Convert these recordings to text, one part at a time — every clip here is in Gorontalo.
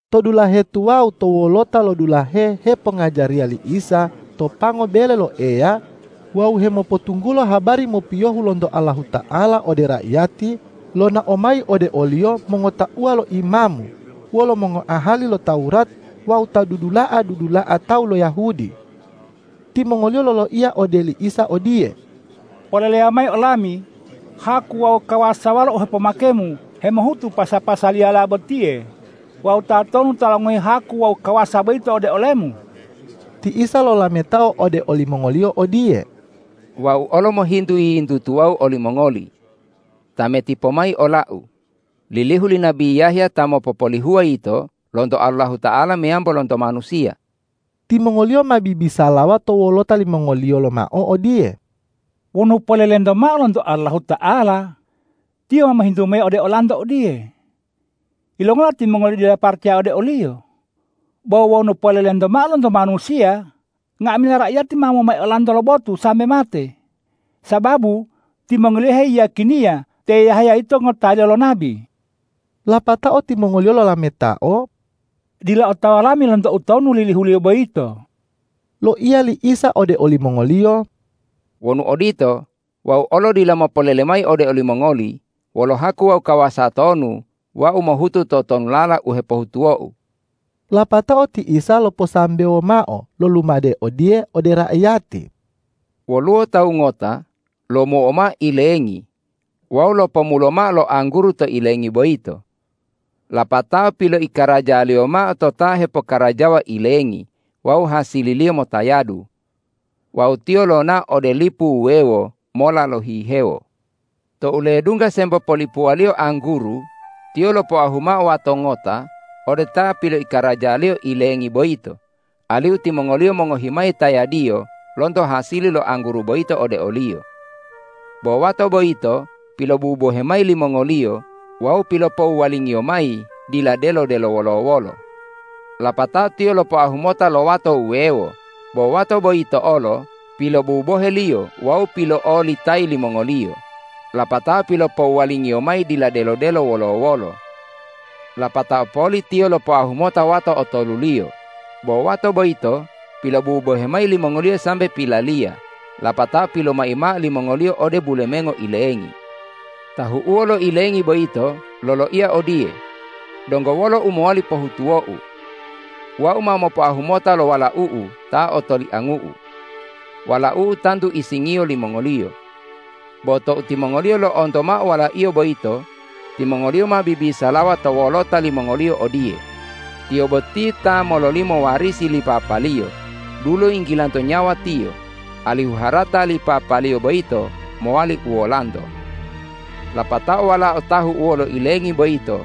To dulahe tuwawu to wolota lo dulahe hepongajariya li Isa to pango bele lo Eya wawu hemopotunggulo habari mopiyohu lonto Allahuta'ala ode raiyati, lonao mayi ode o-Liyo mongotauwa lo imamu wolo mongoahali lo Tawurat wawu ta dudula'a-dudula'a tawu lo Yahudi. Timongoliyo loloiya ode li Isa odiye,”Poleleya mayi olami haku wawu kawasa wolo u hepomake-Mu hemohutu pasa-pasaliyala botiye wawu tatonu ta longohi haku wawu kawasa boyito ode ole-Mu?” Ti Isa lolametao ode olimongoliyo odiye,”Wau olo mohintu yiyintu tuwawu olimongoli. Tameti pomayi ola-U: Lilihu li nabi Yahya ta mopopolihuwa yito lonto Allahuta'ala meyambo lonto manusiya?” Timongoliyo ma bibisalawa to wolota limongoliyo lomao odiye,”Wonu polelento mao lonto Allahuta'ala, Tiyo ma mohintu mayi ode olanto odiye, ’Yilongola timongoli dila paracaya ode oliyo?’ Bo wonu polelento mao lonto manusiya, nga'amila raiyati ma momai olanto lo botu sambe mate, sababu timongoliyo heyiyakiniya te Yahya yito ngotaliyo lo nabi.” Lapatao timongoliyo lolametao,”Dila otawa lami lonto utonu lilihuliyo boyito.” Loiya li Isa ode olimongoliyo,”Wonu odito, Wau olo dila mopolele mayi ode olimongoli wolo haku wawu kawasa tonu Wau mohutu totonulala u hepohutuwo-U.” Lapatao ti Isa loposambewo mao lo lumade odiye ode raiyati,”Woluwo tawu ngota lomuo mao ilengi wawu lopomulo mao lo angguru to ilengi boyito. Lapatao piloikarajaliyo mao to ta hepokarajawa ilengi wawu hasililiyo motayadu. Wawu tiyo lonao ode lipu wuwewo mola lohihewo. Tou ledungga sembo polipuwaliyo angguru, tiyo lopoahu mao wato ngota ode ta piloikarajaliyo ilengi boyito, alihu timongoliyo mongohi mayi tayadiyo lonto hasili lo angguru boyito ode oliyo. Bo wato boyito pilobubohe mayi limongoliyo wawu pilopowuwalingiyo mayi dila delo-delo wolo-wolo. Lapatao tiyo lopoahu mota lo wato wuwewo, bo wato boyito olo pilobuboheliyo wawu pilo'olitayi limongoliyo, lapatao pilopowuwalingiyo mayi dila delo-delo wolo-wolo. Lapatao poli tiyo lopoahu mota wato otoluliyo, bo wato boyito pilobubohe mayi limongoliyo sambe pilaliya, lapatao pilomai mao limongoliyo ode bulemengo ilengi. Tahu'uwo lo ilengi boyito loloiya odiye, ’Donggo wolo u mowali pohutuwou? Wau ma mopoahu mota lo walau'u ta otoliangu'u. Walau'u tantu isingiyo limongoliyo!’ Bo tou timongoliyo lo'onto mao walaiyo boyito, timongoliyo ma bibisalawa to wolota limongoliyo odiye, ’Tiyo boti ta mololimo warisi li papaliyo. Dulo yinggilanto nyawa tiyo, alihu harata li papaliyo boyito mowali uwolanto.’ Lapatao walao tahu'uwo lo ilengi boyito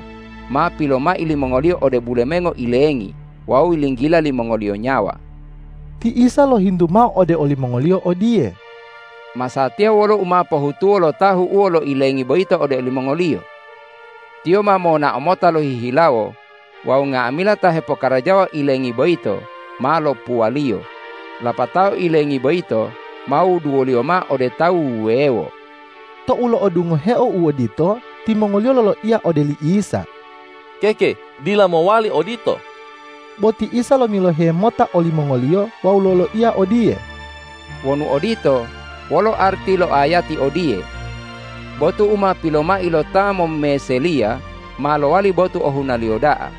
ma pilomai limongoliyo ode bulemengo ilengi wawu yilinggila limongoliyo nyawa.” Ti Isa lohintu mao ode olimongoliyo odiye,”Masatiya wolo u ma pohutuwo lo tahu'uwo lo ilengi boyito ode olimongoliyo? Tiyo ma monao mota lohihilawo wawu nga'amila ta hepokarajawa ilengi boyito ma lopuwaliyo, lapatao ilengi boyito ma wuduwoliyo mao ode tawu wuwewo.” Tou lo'odungoheo u odito, timongoliyo loloiya ode li Isa,”Keke, dila mowali odito.” Bo ti Isa lomilohe mota olimongoliyo wawu loloiya odiye,”Wonu odito, wolo arti lo ayati odiye? ’Botu u ma pilomai lo ta mommeseliya ma lowali botu ohunaliyo da'a.’”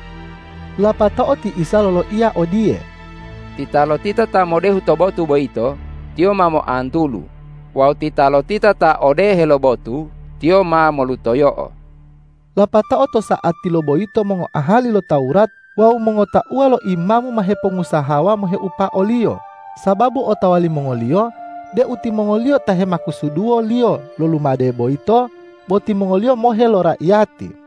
Lapatao ti Isa loloiye odiye,”Titalotita ta modehu to botu boyito, tiyo ma moantulu; wawu titalotita ta odehe lo botu, tiyo ma molutoyo'o.” Lapatao to sa'atilo boyito mongoahali lo Tawurat wawu mongotauwa lo imamu ma hepongusahawa moheupa o-Liyo, sababu otawa limongoliyo deu timongoliyo ta hemakusuduwo-Liyo lo lumade boyito, bo timongoliyo mohe lo raiyati.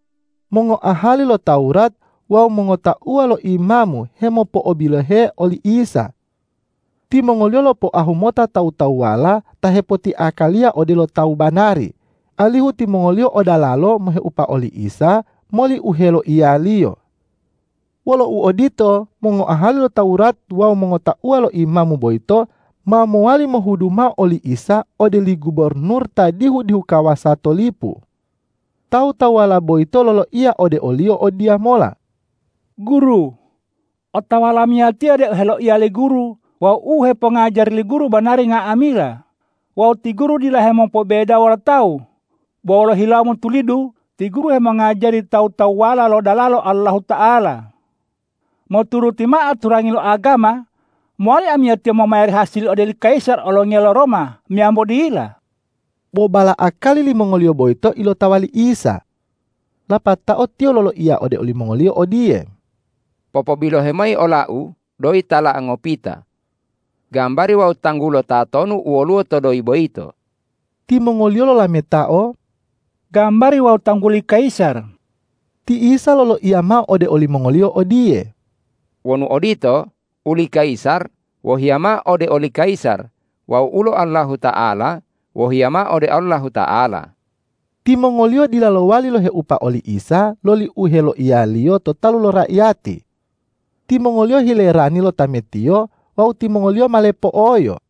Mongoahali lo Tawurat wawu mongotauwa lo imamu hemopo'obilohe oli Isa. Timongoliyo lopoahu mota tawu-tawuwala ta hepotiakaliya odelo tawu banari, alihu timongoliyo o dalalo moheupa oli Isa moli u heloiya-Liyo. Wolo uodito, mongoahali lo Tawurat wawu mongotauwa lo imamu boyito ma mowali mohudu mao oli Isa ode li gubornur ta dihu-dihu kawasa to lipu. Tawu-tawuwala boyito loloiya ode o-Liyo odiyamola,”Guru, otawa lamiyatiya deu heloiya li Guru wawu u hepongajari li Guru banari nga'amila wawu ti Guru dila hemopobedawo lo tawu, bo wolo hilawo motulidu ti Guru hemongajari tawu-tawuwala lo dalalo Allahuta'ala. Moturuti mao aturangi lo agama mowali amiyatiya momayari hasili ode oli kayisar olongiya lo Roma meyambo dila?” Bo bala'akali limongoliyo boyito ilotawa li Isa. Lapatao Tiyo loloiya ode olimongoliyo odiye, ”Popobilohe mayi ola-U doyi tala'a ngopita. Gambari wawu tanggulo tatonu u woluwo to doyi boyito?” Timongoliyo lolametao,”Gambari wawu tangguli kayisar!” Ti Isa loloiya mao ode olimongoliyo odiye,”Wonu odito, uli kayisar wohiya mao ode oli kayisar wawu ulo Allahuta'ala wohiya mao ode Allahuta'ala.” Timongoliyo dila lowali loheupa oli Isa loli u heloiya-Liyo to talu lo raiyati. Timongoliyo hilerani lo tame-Tiyo wawu timongoliyo ma lepo'oyo.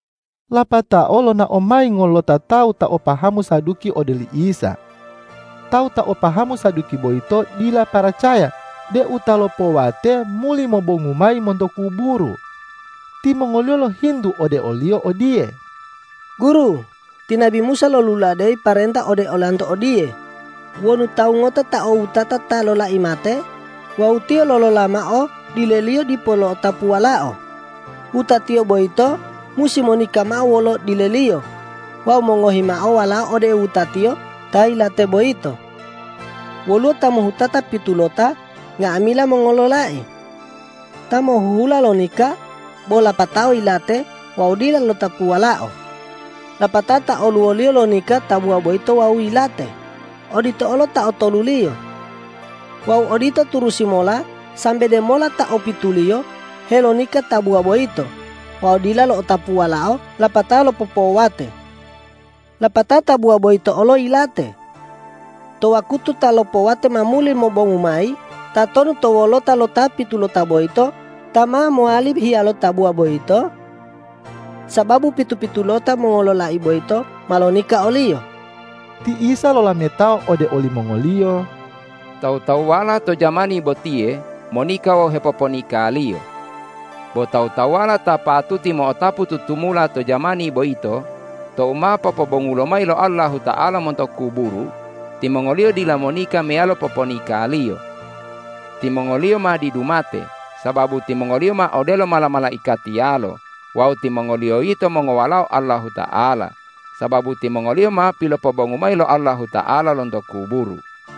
Lapatao lonao mayi ngololota tawu ta o pahamu Saduki ode li Isa. Tawu ta o pahamu Saduki boyito dila paracaya deu ta lopowate muli mobongu mayi monto kuburu. Timongoliyo lohintu ode o-Liyo odiye, ”Guru, ti nabi Musa loluladeyi parenta ode olanto odiye: Wonu tawu ngota ta o wutata ta lolai mate wawu tiyo lolola mao dileliyo dipo lo'otapu walao, wutatiyo boyito musi monika mao wolo dileliyo wawu mongohi mao walao ode wutatiyo ta yilate boyito. Woluwo ta mohutata pitulota, nga'amila mongololai. Ta mohuhula lonika, bo lapatao yilate wawu dila lotapu walao. Lapatao ta oluwoliyo lonika tabuwa boyito wawu yilate, odito olo ta otoluliyo. Wawu odito turusi mola sambe demola ta opituliyo helonika tabuwa boyito wawu dila lo'otapu walao lapatao lopopowate. Lapatao tabuwa boyito olo yilate. To wakutu ta lopowate ma muli mobongu mayi, tatonu to wolota lo ta pitulota boyito ta ma mowali hiyalo tabuwa boyito? Sababu pitu-pitulota mongololai boyito ma lonika oliyo.” Ti Isa lolametao ode olimongoliyo,”Tawu-tawuwala to jamani botiye monika wawu hepoponikaliyo. Bo tawu-tawuwala ta patuti mo'otapu tutumula to jamani boyito tou ma popobongulo mayi lo Allahuta'ala monto kuburu, timongoliyo dila monika meyalo poponikaliyo. Timongoliyo ma didu mate, sababu timongoliyo ma odelo mala-malaikatiyalo wawu timongoliyo yito mongowalao Allahuta'ala, sababu timongoliyo ma pilopobongu mayi lo Allahuta'ala lonto kuburu.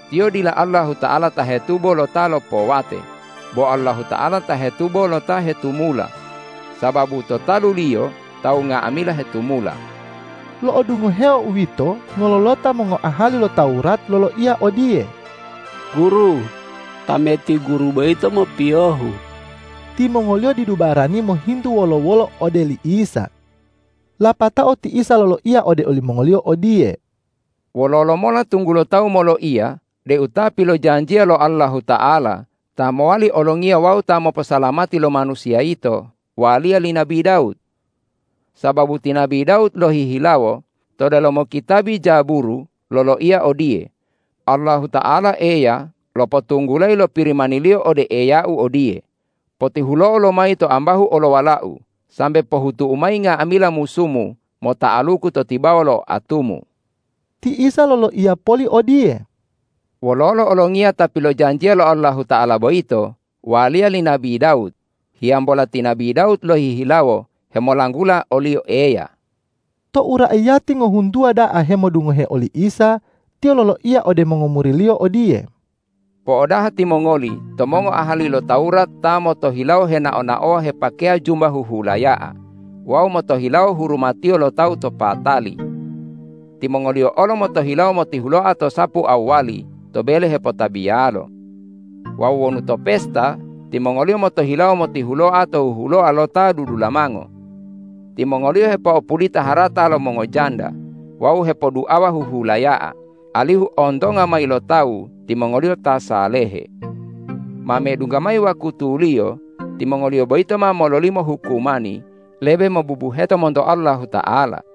Tiyo dila Allahuta'ala ta hetubo lo ta lopowate, bo Allahuta'ala ta hetubo lo ta hetumula, sababu to talu-Liyo tawu nga'amila hetumula.” Lo'odungoheo uwito, ngololota mongoahali lo Tawurat loloiya odiye,”Guru, tameti Guru boyito mopiyohu.” Timongoliyo didu barani mohintu wolo-wolo ode li Isa. Lapatao ti Isa loloiya ode olimongoliyo odiye,”Wololo mola tunggulo tawu moloiya deu Ta pilojanjiya lo Allahuta'ala ta mowali olongiya wawu ta moposalamati lo manusiya yito waliya li nabi Dawud? Sababu ti nabi Dawud lohihilawo to delomo kitabi Jaburu loloiya odiye, ’Allahuta'ala Eya lopotunggulayi lo Pirimani-Liyo ode Eyau odiye: Potihulo'o lomayi to ambahu olowala-U, sambe pohutu-U mayi nga'amila musu-Mu mota'aluku to tibawa lo oatu-Mu.’” Ti Isa loloiya poli odiye,”Wololo Olongiya ta pilojanjiya lo Allahuta'ala boyito waliya li nabi Dawud hiyambola ti nabi Dawud lohihilawo hemolanggula oliyo Eya?” Tou raiyati ngohuntuwa da'a hedungohe oli Isa, Tiyo loloiya ode mongomuri-Liyo odiye, ”Po'odaha timongoli to mongoahali lo Tawurat ta motohilawo henao-naowa hepakeya jumba huhulaya'a wawu motohilawo hurumatiyo lo tawu to patali. Timongoliyo olo motohilawo motihuloa to sapu awwali to bele hepotabiyalo. Wawu wonu to pesta, timongoliyo motohilawo motihuloa to huhuloa lo ta dudulamango. Timongoliyo hepo'opulita harata lo mongojanda wawu hepoduawa huhulaya'a, alihu ontonga mayi lo tawu timongoliyo ta salehe. Ma medungga mayi wakutuliyo timongoliyo boyito ma mololimo hukumani lebe mobubuheto monto Allahuta'ala.”